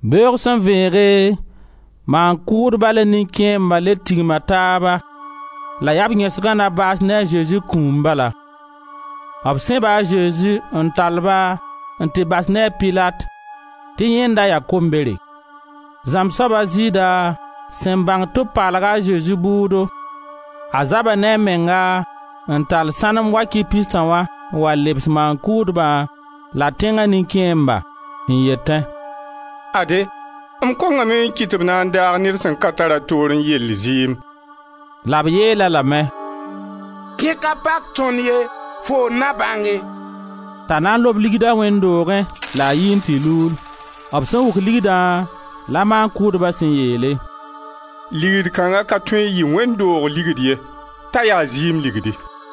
Beoog sẽn vẽege, maan-kʋʋdba la nin-kẽemba le tigma taaba la yaa b yẽsgã na baas ne a Zezi kũum bala. B sẽba a Zezi n tall-ba n tɩ bas ne a Pilat tɩ yẽ n da ya kombere. Zãmb soab a Zɩɩda sẽn bãng tɩ b paalga a Zezi bʋʋdo, a zaba ne a menga n tall sãnem wakɩ pistã wã n wa lebs maan-kʋʋdba la tẽnga nin-kẽembã, n yetẽ: «Ade, m kongame n kɩt tɩ b na n daag ned sẽn ka tar a toorẽ yell zɩɩm.» La b yeel-a lame: «Dẽ ka pak tõnd ye, foo n na bãnge.» T'a na n lob ligda wẽnd doogẽ la a yi n tɩ luul. B sẽn wʋk ligdã, la maan-kʋʋdba sẽn yeele: «Ligd kãnga ka tõe n yɩ wẽnd doog ligd ye, t'a yaa zɩɩm ligdi.»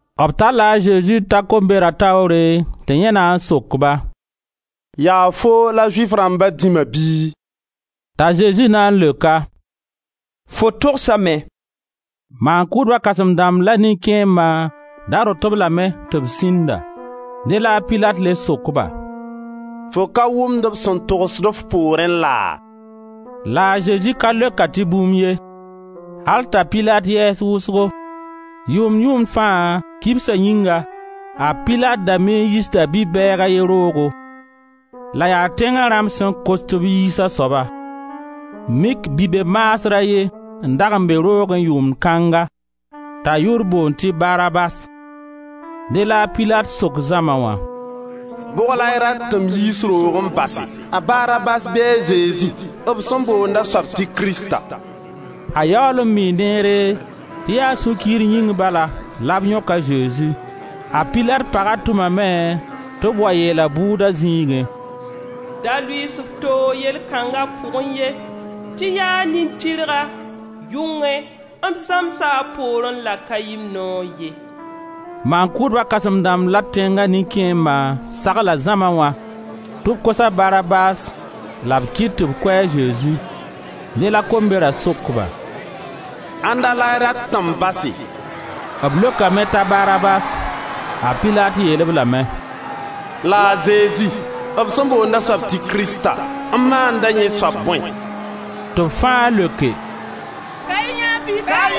B talla a Zezi n ta kombera taoore tɩ yẽ na n sok-ba: «Yaa foo la Zʋɩf rãmba dĩma bɩ?» T'a Zezi na n leok-a: «Fo togsame.» Maan-kʋʋdba kãsẽm-dãmb la nin-kẽemba ra rõt-b lame tɩ b sĩnda. Dẽ la a Pilat le sok-ba: «Fo ka wʋmd b sẽn togsd f poorẽ laa?» La a Zezi ka leok-a tɩ bũmb ye, al t'a Pilat yɛɛs wʋsgo. Yʋʋmd-yʋʋmd fãa, kibsa yĩnga, a Pilat da mii n yiisda bi-bɛɛg a ye roogo, la yaa tẽnga rãmb sẽn kos tɩ b yiis a soaba. Mik bi-be-maasr a ye n dag n be roogẽ yʋʋmd kãnga t'a yʋʋr boond tɩ Barabas. Dẽ la a Pilat sok zãma wã: «Bʋg la y rat tɩ m yiis roog n base, a Barabas bɩ a Zezi, b sẽn boond a soab tɩ Krista?» A yaool n mii neere tɩ yaa sũ-kiir yĩng bala la b yõk a Zezi. A Pilat paga tʋmame tɩ b wa yeel-a bʋʋda zĩigẽ: «Da lʋɩɩs f toog yell kãnga pʋgẽ ye tɩ yaa nin-tɩrga; yʋngẽ m zãmsa a poorẽ la ka yɩ-m noog ye.» Maan-kʋʋdba kãsẽm-dãmb la tẽnga nin-kẽemba sagla zãma wã tɩ b kos a Barabas la b kɩt tɩ b kʋ a Zezi. Dẽ la Kombera sok-ba: «Ãnda la y rat tɩ m base?» B leokame t'a Barabas. A Pilat yeel-b lame: «La a Zezi, b sẽn boond a soab tɩ Krista, m maanda yẽ soab bõe?» Tɩ b fãa leoke: «Ka-y yẽe pika!»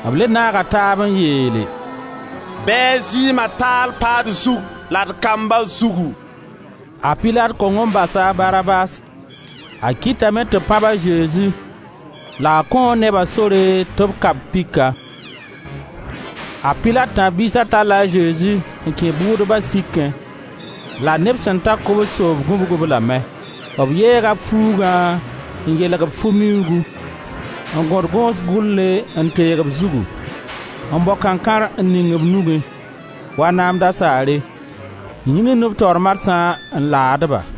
B le naaga taab n yeele: «Bɩ a zɩɩma taal pa d zug la d kamba zugu.» A Pilat kong n basa a Barabas; a kɩtame tɩ b pãb a Zezi la a kõo neba sore tɩ b ka-b pika. A Pilat tãb-biisa talla a Zezi n kẽ bʋʋdba sikẽ la neb sẽn ta kobs-yoob gũbg-b lame. B yeega b fuugã n yeelg-b fu miuugu, n gõd gõos gʋle n teeg b zugu; n bao kãnkãr n ning b nugẽ, (wa naam dasaare) n yĩgimd b taoor marsã n laad ba: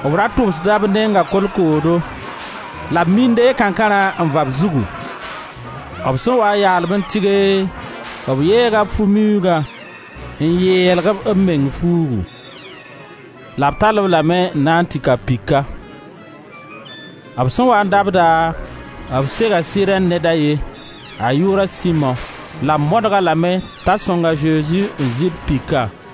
B ra tʋbsda b nenga kolkoodo la b mii n deeg kãnkãrã n va b zugu. B sẽn waa n yaal-ba n tɩge, b yeega fu-miuugã n yeelg-b b meng fuugu, la b tall-b lame n na n tɩ ka pika. B sẽn waa n dabda, b sega Sirɛn ned a ye, a yʋʋr a Simo, la b modg-a lame t'a sõng a Zezi n zɩ b pika.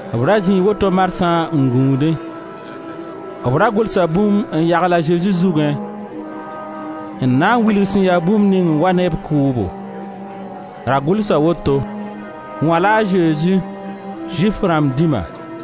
B ra zĩi woto marsã n gũudẽ. B ra gʋlsa bũmb n yagl a Zezi zugẽ, n na n wilg sẽn ya bũmb ning n wa ne b kʋʋbo; ra gʋlsa woto: «Wã la a Zezi, Zʋɩf rãmb dĩma.»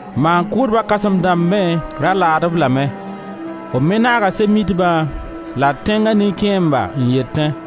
Maan-kʋʋdba kãsem-dãmb me ra laad-b lame; b me naaga Sɛb-mitba la tẽnga nin-kẽemba n yetẽ: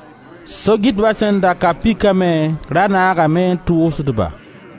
So-gɩtba sẽn da ka pika me ra naagame n tʋʋsd ba.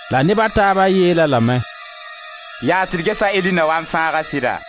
La neb a taaba yeel-a lame: «Yaas tɩ d ges a Eli na wa n fãag-a sɩda!»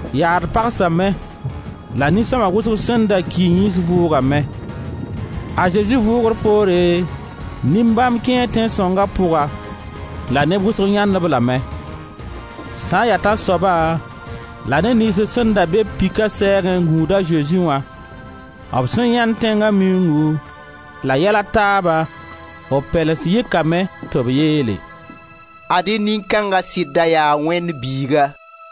yaad pagsame la nin-sõma wʋsg sẽn da ki yĩns vʋʋgame. A Zezi vʋʋgr poore nin-bãmb kẽe Tẽn-sõnga pʋga la neb wʋsg yãend-b lame. Sã n ya tãnsoaba la neb niyns sẽn da be-b pika sɛɛga n gũud a Zezi wã, b sẽn yãend tẽnga miuungu la yɛl a taaba, b pɛlens yɩkame tɩ b yeele: «Ad-y nin-kãnga sɩd da yaa Wẽnd Biiga.»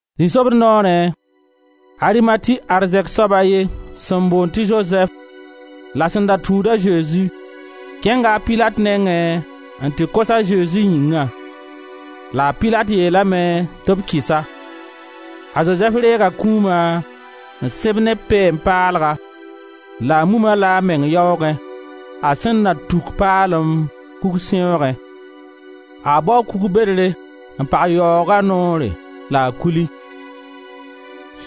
Zĩ-sobd noorẽ, Arimati arzɛk soab a ye sẽn boond tɩ Zozɛf la sẽn da tũud a Zezi, kẽnga a Pilat nengẽ n tɩ kos a Zezi yĩngã. La a Pilat yeelame tɩ b kɩs-a. A Zozɛf reega kũuma n sẽb ne peen-paalga, la a mum-a-la a meng yaoogẽ, a sẽn nan tuk paalem kugsẽoogẽ. A baoo kug bedre n pag yaooga noor la a kuli.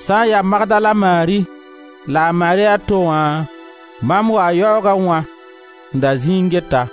Sã n yaa Magdala Mari la Mari a to wã bãmb waa yaoogẽ wã n da zĩi n get-a.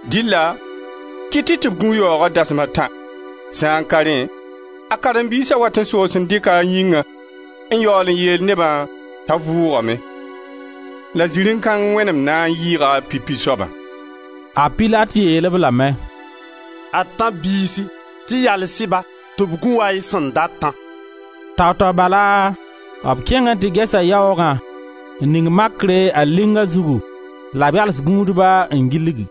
Dɩlla kɩt-y tɩ b gũ yaooga dasm a tã, sã n ka rẽ, a karen-biisa wat n soos n dɩka a yĩnga n yaool n yeel neba t'a vʋʋgame, la ziri kãng wẽnem na n yɩɩga pipi soabã.» A Pilat yeel-b lame: «Ad tãb-biisi, tɩ yals-y-ba tɩ b gũ wa y sẽn datã.» Tao-tao bala b kẽngame n tɩ ges yaoogã, n ning makre a linga zugu la b yals gũudba n gilg.